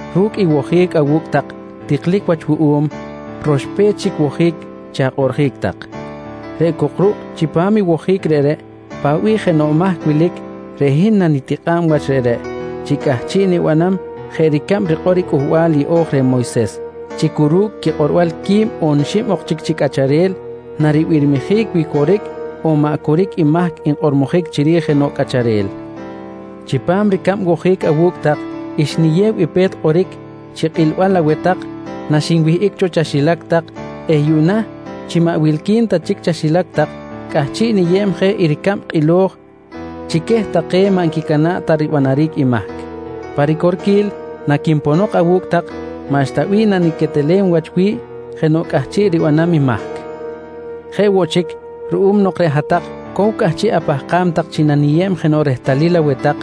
Ru̱cꞌ i wojic awu̱cꞌ tak tiklic wach wuꞌum, roxpech chic wojic chi akꞌoꞌrjic tak. Reꞌ cok ruꞌ chipam i wojic reꞌreꞌ paꞌ bih jenoꞌ mahc wilic, reꞌ hin nanitikꞌa̱b wach reꞌreꞌ chi cꞌahchiꞌ nibanam jeꞌ ricab rikꞌor i Cꞌuhbal yeꞌo̱j reh Moyses chi cu ru̱cꞌ quikꞌorbal quib on xib ok chic chi cꞌacharel naribirmijic wi coric on maꞌ coric i mahc nkꞌormojic chiri̱j jenoꞌ cꞌacharel. Chipam ricab wojic awu̱cꞌ tak xniyew i pe̱t kꞌoric chi kꞌilbal aweh tak naxinwihꞌic cho chaxilac tak eh yuꞌna chi maꞌ wilqui̱n ta chic chaxilac tak cꞌahchiꞌ niyeb je i ricab kꞌilo̱j chi queh take maꞌ nquicana̱ꞌ ta ribanaric i mahc. Pa ricorquil, naquinponok awu̱cꞌ tak maꞌxta bih naniquetelem wach wi̱ꞌ jenoꞌ cꞌahchiꞌ ribanam i mahc. Jeꞌ woꞌ chic ruꞌum nok reꞌ hat-tak cow cꞌahchiꞌ apahkam tak chi naniyeb jenoꞌ rehtalil aweh tak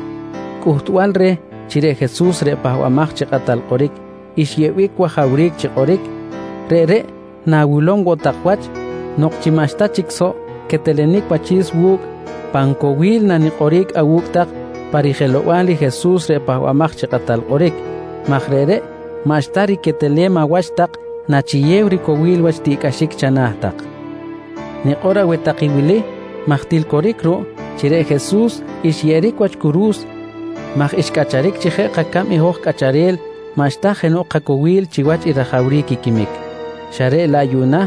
cꞌuhtbal reh chi reꞌ Jesus reꞌ Pahbamaj chi Kꞌatal Kꞌoric xyeꞌbic wajawric chi kꞌoric, reꞌreꞌ nawilom woꞌ tak wach nok chi maꞌxta chic soꞌ quetelenic wachi̱s wu̱cꞌ, pan cowil nanikꞌoric awu̱cꞌ tak pa rijelow-bal i Jesus reꞌ Pahbamaj chi Kꞌatal Kꞌoric maj reꞌreꞌ maꞌxta riquetelem awach tak nachiyew ricowil wach tiꞌcꞌaxic chana̱ tak. Nikꞌor aweh tak i wili maj til coric ruꞌ chi reꞌ Jesus xyeꞌeric wach curu̱s maj xcꞌacharic chi jeꞌ kacab i hoj cꞌacharel maꞌxta jenoꞌ kacowil chiwach i rajawric i quimic, xa reꞌ laꞌ yuꞌna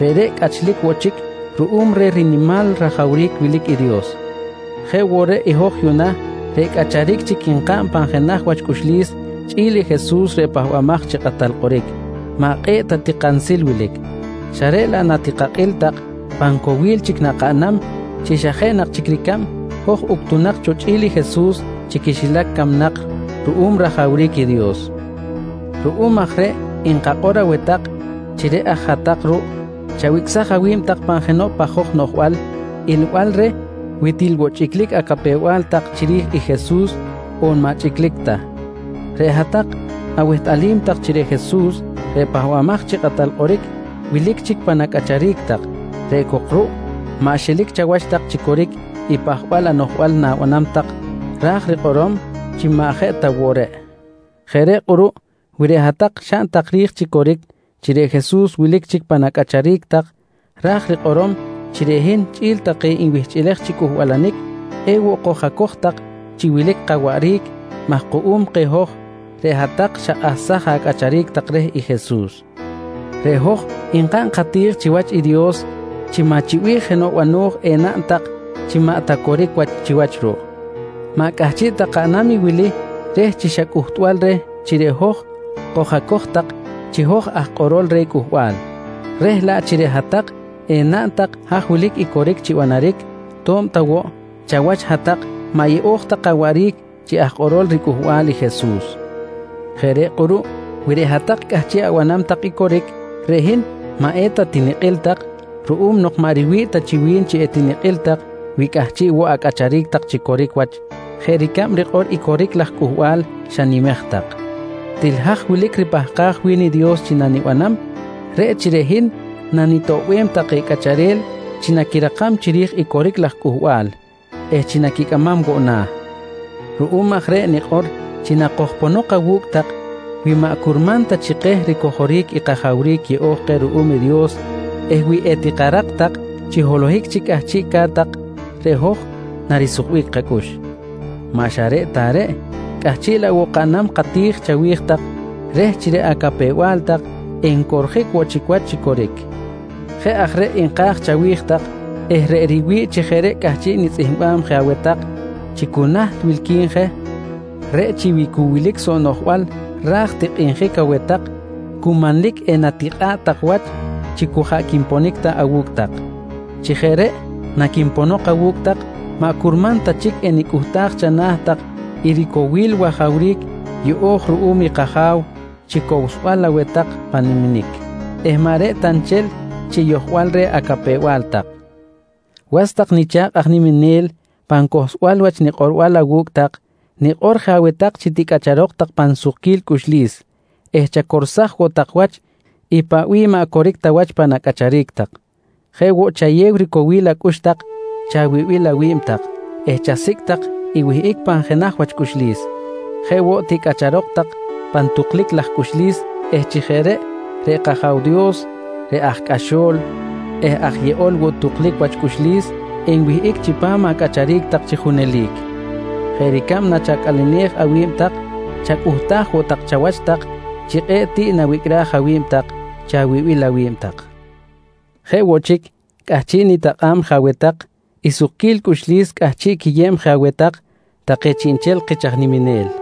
reꞌreꞌ cꞌachlic woꞌ chic ruꞌum reh rinimal rajawric wilic i Dios. Jeꞌ woꞌ reꞌ i hoj yuꞌna reꞌ cꞌacharic chic nkaꞌn pan jenaj wach cꞌuxlis chꞌi̱l i Jesus reꞌ Pahbamaj chi Kꞌatal Kꞌoric maꞌ kꞌe̱ꞌ ta ti kansil wilic, xa reꞌ laꞌ natikakꞌil tak pan cowil chic nakaꞌnam chi xa jeꞌ na chic ricab hoj uctunak cho chꞌi̱l i Jesus chi quixilac camnak ruꞌum rajawric i Dios. Ruꞌum aj reꞌ nkakꞌor aweh tak chi reꞌ aj hat-tak ruꞌ chawicꞌsaj awi̱b tak pan jenoꞌ pajoj noꞌjbal ilbal reh wi til woꞌ chi chꞌiclic acapew-bal tak chiri̱j i Jesus on maꞌ chꞌiclic ta. Reꞌ hat-tak awehtꞌalim tak chi reꞌ Jesus reꞌ Pahbamaj chi Kꞌatal Kꞌoric wilic chic pan acꞌacharic tak reꞌ cok ruꞌ maꞌ xelic chawach tak chi coric i pajbal anoꞌjbal na̱banam tak ra̱j rikꞌorom chi maꞌ jeꞌ ta woꞌ reꞌ. Jeꞌ reꞌ kꞌuruꞌ wi reꞌ hat-tak xaꞌn tak ri̱j chi coric chi reꞌ Jesus wilic chic pan acꞌacharic tak ra̱j rikꞌorom chi reꞌ hin chꞌi̱l take nwihchꞌilej chi cꞌuhbalanic ewoꞌ koj-acoj tak chi wilic kawaꞌric maj kuꞌum keh hoj reꞌ hat-tak xakꞌahsaj acꞌacharic tak reh i Jesus. Reꞌ hoj nkaꞌn kati̱j chiwach i Dios chi maꞌ chi bih jenoꞌ bano̱j enaꞌn tak chi maꞌ ta coric wach chiwach ruꞌ. Maꞌ cꞌahchiꞌ ta kaꞌnam i wili reh chi xa cꞌuhtbal reh chi reꞌ hoj koj-acoj tak chi aj kꞌorol reh cꞌuhbal, reh laꞌ chi reꞌ hat-tak enaꞌn tak haj wilic i coric chi banaric to̱b ta woꞌ chawach hat-tak maꞌ yeꞌo̱j ta kawaꞌric chi aj kꞌorol riCꞌuhbal i Jesus. Jeꞌ reꞌ kꞌuruꞌ wi reꞌ hat-tak cꞌahchiꞌ abanam tak i coric, reꞌ hin maꞌ eta tinikꞌil tak ruꞌum nok maꞌ riwi̱ꞌ ta chi wi̱n chi etinikꞌil tak wi cꞌahchiꞌ woꞌ acꞌacharic tak chi coric wach jeꞌ ricab rikꞌor i coric laj cꞌuhbal xanimej tak. Til haj wilic ripahkaj wi̱n i Dios chi nanibanam, reꞌ chi reꞌ hin nanitoꞌbem take cꞌacharel chi naquirakam chiri̱j i coric laj cꞌuhbal eh chi naquicꞌamam woꞌ na̱. Ruꞌum aj reꞌ nikꞌor chi nakojponok awu̱cꞌ tak, wi maꞌ curman ta chi keh ricojoric i kajawric yeꞌo̱j keh ruꞌum i Dios eh wi etikarak tak chi holohic chic cꞌahchiꞌca̱t tak, reꞌ hoj narisukbic kacꞌux. Maꞌ xa reꞌ ta reꞌ, cꞌahchiꞌ laꞌ woꞌ kaꞌnam kati̱j chawi̱j tak reh chi reꞌ acapew-bal tak encorjic woꞌ chic wach chi coric. Jeꞌ aj reꞌ nka̱j chawi̱j tak eh reꞌ riwi̱ꞌ chi jeꞌ reꞌ cꞌahchiꞌ nitzꞌihmbam je aweh tak chi cu naht wilqui̱n je, reꞌ chi wi cu wilic soꞌ noꞌjbal ra̱j tikꞌinjic aweh tak cu manlic enatikꞌa̱ꞌ tak wach chi cu jaꞌ quinponic ta awu̱cꞌ tak. Chi jeꞌ reꞌ naquinponok awu̱cꞌ tak maꞌ curman ta chic enicꞌuhtaj chana̱ tak i ricowil i wajawric yeꞌo̱j ruꞌum i kAja̱w chi cowsbal aweh tak pan niminic eh maꞌ reꞌ ta nchel chi yojbal reh acapew-bal tak. Was tak nicha̱kꞌ aj niminel pan cohlsbal wach nikꞌorbal awu̱cꞌ tak, nikꞌor je aweh tak chi ticꞌacharok tak pan sukquil cꞌuxlis eh chacorsaj woꞌ tak wach i paꞌ bih maꞌ coric ta wach pan acꞌacharic tak. Jeꞌ woꞌ chayew ricowil acꞌux tak chawibil awi̱b tak eh chasicꞌ tak i wihꞌic pan jenaj wach cꞌuxlis. Jeꞌ woꞌ ticꞌacharok tak pan tuklic laj cꞌuxlis eh chi jeꞌ reꞌ, reꞌ kAja̱w Dios reꞌ aj cꞌaxo̱l eh aj yeꞌol woꞌ tuklic wach cꞌuxlis enwihꞌic chipam acꞌacharic tak chi junelic. Jeꞌ ricab nachacꞌalenej awi̱b tak chacꞌuhtaj woꞌ tak chawach tak chi kꞌe̱ꞌ tiꞌ nawicꞌraj awi̱b tak chi awibil awi̱b tak. Jeꞌ woꞌ chic, cꞌahchiꞌ nitakꞌa̱b je aweh tak i sukquil cꞌuxlis cꞌahchiꞌ quiyeb je aweh tak take chiꞌnchel kich aj niminel.